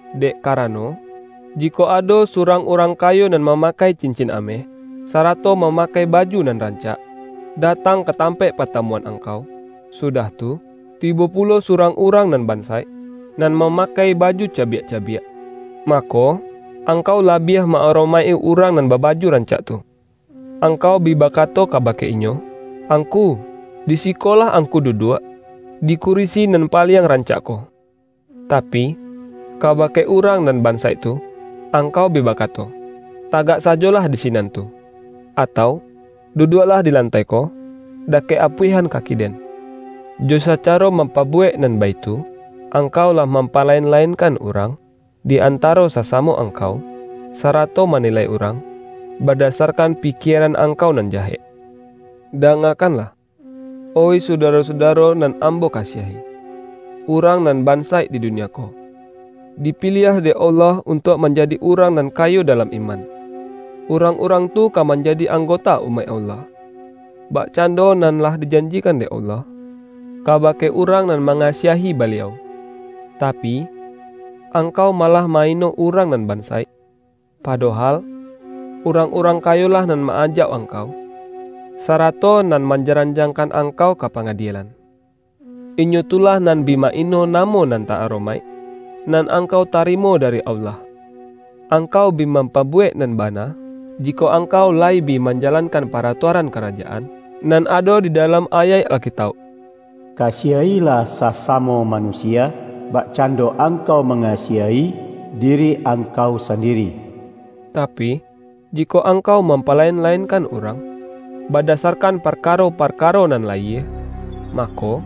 Dek karano, jikok ado surang urang kayo nan mama-kai cincin ameh, sarato mamakai ba-ju nan rancak, datang ka tampaik pa-tamuan angkau, sudah tu, tibo pulo surang urang nan bansaik, nan mama-kai baju cabiak-cabiak, mako, ang-kau labiah ma-aromaik-i urang nan babaju rancak tu. Angkau bi baka-to kabake inyo,”Angku, di siko lah angku duduak, di kurisi nan paliang rancak ko.” Tapi, kabake urang nan bansaik tu, angkau bi bakato,”Tagak sajolah di sinan tu,” atau”Duduaklah di lantai ko, dakek apuihan kaki den.” Jo sacaro mampabuwek nan baitu, angkau lah mampalain-lainkan urang di antaro sasamo angkau, sarato ma-nilai urang badasarkan pikieran ang-kau nan jahek. Dangakanlah, oih sudaro-sudaro nan ambo kasiahi! Urang nan ban-saik di dunia ko, dipiliah dek Allah untuak manjadi urang nan kayo da-lam iman. Urang-urang tu ka man-jadi anggota umaik Allah, bakcando nan lah dijanjikan dek Allah, kaba-ke urang nan mangasiahi Baliau. Ta-pi, angkau malah ma-ino urang nan bansaik, padohal, urang-urang kayo-lah nan ma-ajauk angkau, sarato nan manjaranjangkan angkau ka panga-dielan! Inyo tu lah nan bi maino namo nan ta-aromaik, nan angkau tari-mo dari Allah! Angkau bi mampabuwek nan ba-na, jikok angkau layi bi manjalankan paratuaran Karajaan, nan ado di da-lam ayaik Alkitauk,”Kasiah-ilah sa-samo manusia, bakcando angkau ma-ngasiahi diri angkau sandiri.” Tapi, jikok angkau mampalain-lainkan urang, badasarkan parkaro-parka-ro nan layie, mako,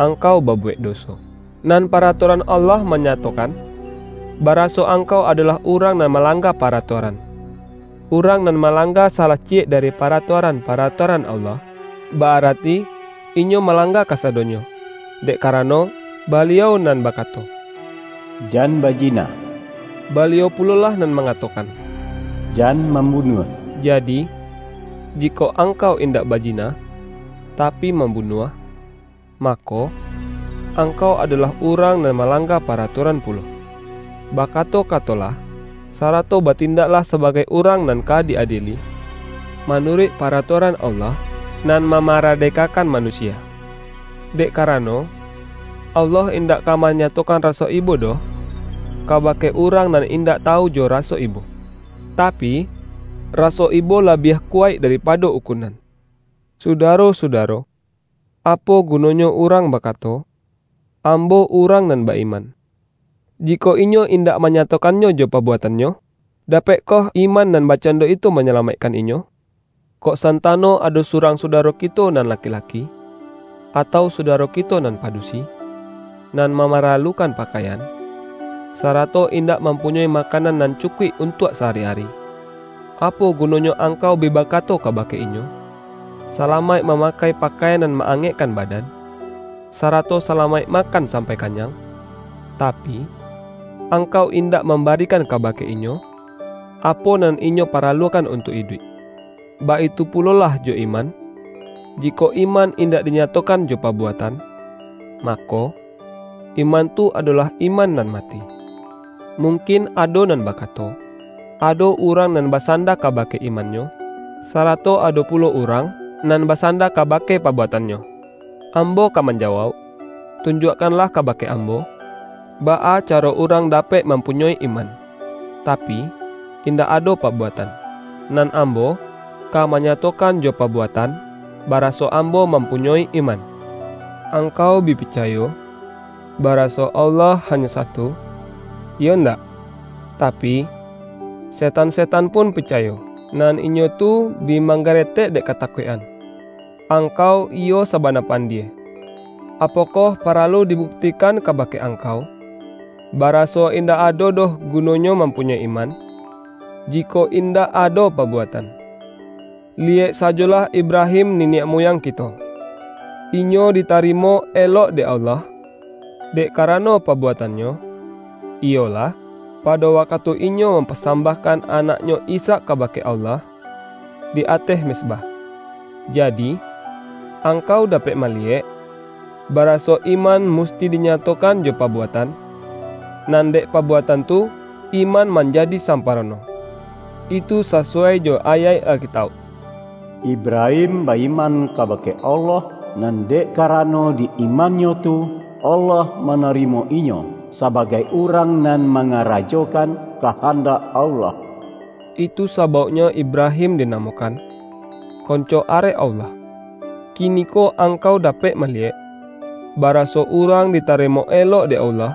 angkau babuwek doso, nan paratuaran Allah manya-tokan, baraso angkau adolah urang nan malangga paratuaran. Urang nan malangga salah ciyek dari pa-ratuaran-paratuaran Allah, ba-ara-ti inyo malangga kasadonyo. Dek karano, Baliau nan bakato,”Jan baji-na,” Baliau pulolah nan mangatokan,”Jan mambunuah.” Jadi, jikok ang-kau indak bajina, tapi mambunuah, mako, angkau adolah urang nan ma-langga paratuaran pulo. Bakato-katolah, sarato batindaklah sabagai urang nan ka di-adieli, manuruik pa-ratuaran Allah nan mamaradekakan manusia. Dek karano, Allah indak ka manyatokan raso ibo doh, kaba-ke urang nan indak tawu jo raso ibo. Tapi, raso ibo labiah kuwaik daripado ukunan! Sudaro-sudaro! Apo gunonyo urang bakato,”Ambo urang nan ba-iman”, jikok inyo indak manyatokan-nyo jo pabuatannyo? Dapekkoh iman nan bakcando itu manyalamaikkan inyo? Kok santano ado surang su-daro kito nan laki-laki, atau sudaro kito nan padusi, nan mamaralukan pakaian, sarato indak mampunyoi makanan nan cukuik untuak sa-ari-ari. Apo gunonyo angkau bi bakato kabake inyo,”Salamaik mamakai pakaian nan ma-angekkan badan, sarato salamaik makan sampai kanyang!” — tapi, angkau indak mambarikan kaba-ke inyo, apo nan inyo paralukan un-tuak iduik? Baitu pulolah jo iman, jikok iman indak dinyatokan jo pa-buatan, mako, iman tu adolah iman nan mati. Mungkin ado nan bakato,”Ado urang nan basanda kabake imannyo, sarato ado pulo urang nan basanda kabake pabuatannyo.” Ambo ka man-jawauk,”Tunjuakkanlah kabake am-bo, baa caro urang dapek mampunyoi iman, tapi, indak ado pabuatan, nan ambo, ka manyatokan jo pabuatan, baraso ambo mampunyoi iman.” Angkau bi picayo, baraso Allah ha-nyo satu, iyo ndak? Tapi, setan-setan pun picayo, nan inyo tu bi manggare-tek dek katakuik-an! Angkau iyo sa-bana pandie! Apokoh paralu dibukti-kan kabake angkau, baraso indak ado doh gunonyo mampunyoi iman, jikok indak ado pabuatan? Liyek sajolah Ibrahim niniak muyang kito. Inyo di-tarimo elok dek Allah, dek karano pa-buatannyo, iyolah, pado wakatu inyo mampasambahkan anaknyo Ishak ka-bake Allah, di ateh mezbah. Jadi, angkau dapek maliyek, baraso iman musti dinyatokan jo pabuatan, nan dek pabuatan tu iman manjadi sampa-rono. Itu sasuwai jo ayaik Alkitauk,”Ibrahim ba-iman kabake Allah, nan dek karano di imannyo tu, Allah ma-narimo inyo sabagai urang nan ma-ngarajokan kahandak Allah.” Itu sa-bauknyo Ibrahim dinamokan,”Konco arek Allah”. Kiniko angkau dapek maliyek, baraso urang ditarimo elok dek Allah,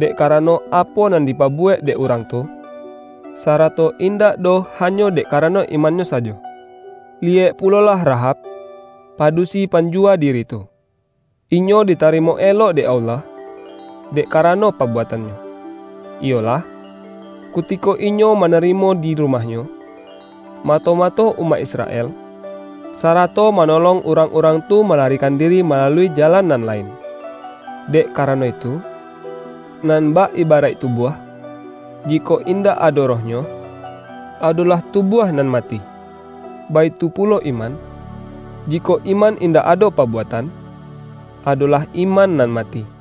dek karano apo nan dipa-buwek dek urang tu, sarato indak doh hanyo dek karano imannyo sajo. Liyek pulolah Rahab, padusi pan-juwa diri tu. Inyo ditarimo elok dek Allah, dek karano pabuatannyo, iyolah, kutiko inyo manarimo di rumah-nyo, mato-mato umaik Israel, sarato manolong urang-urang tu malarikan diri malalui jalan nan lain. Dek karano itu, nan bak ibaraik tubuah, jikok indak ado rohnyo, ado-lah tubuah nan mati, baitu pulo iman, jikok iman indak ado pabuatan, ado-lah iman nan mati.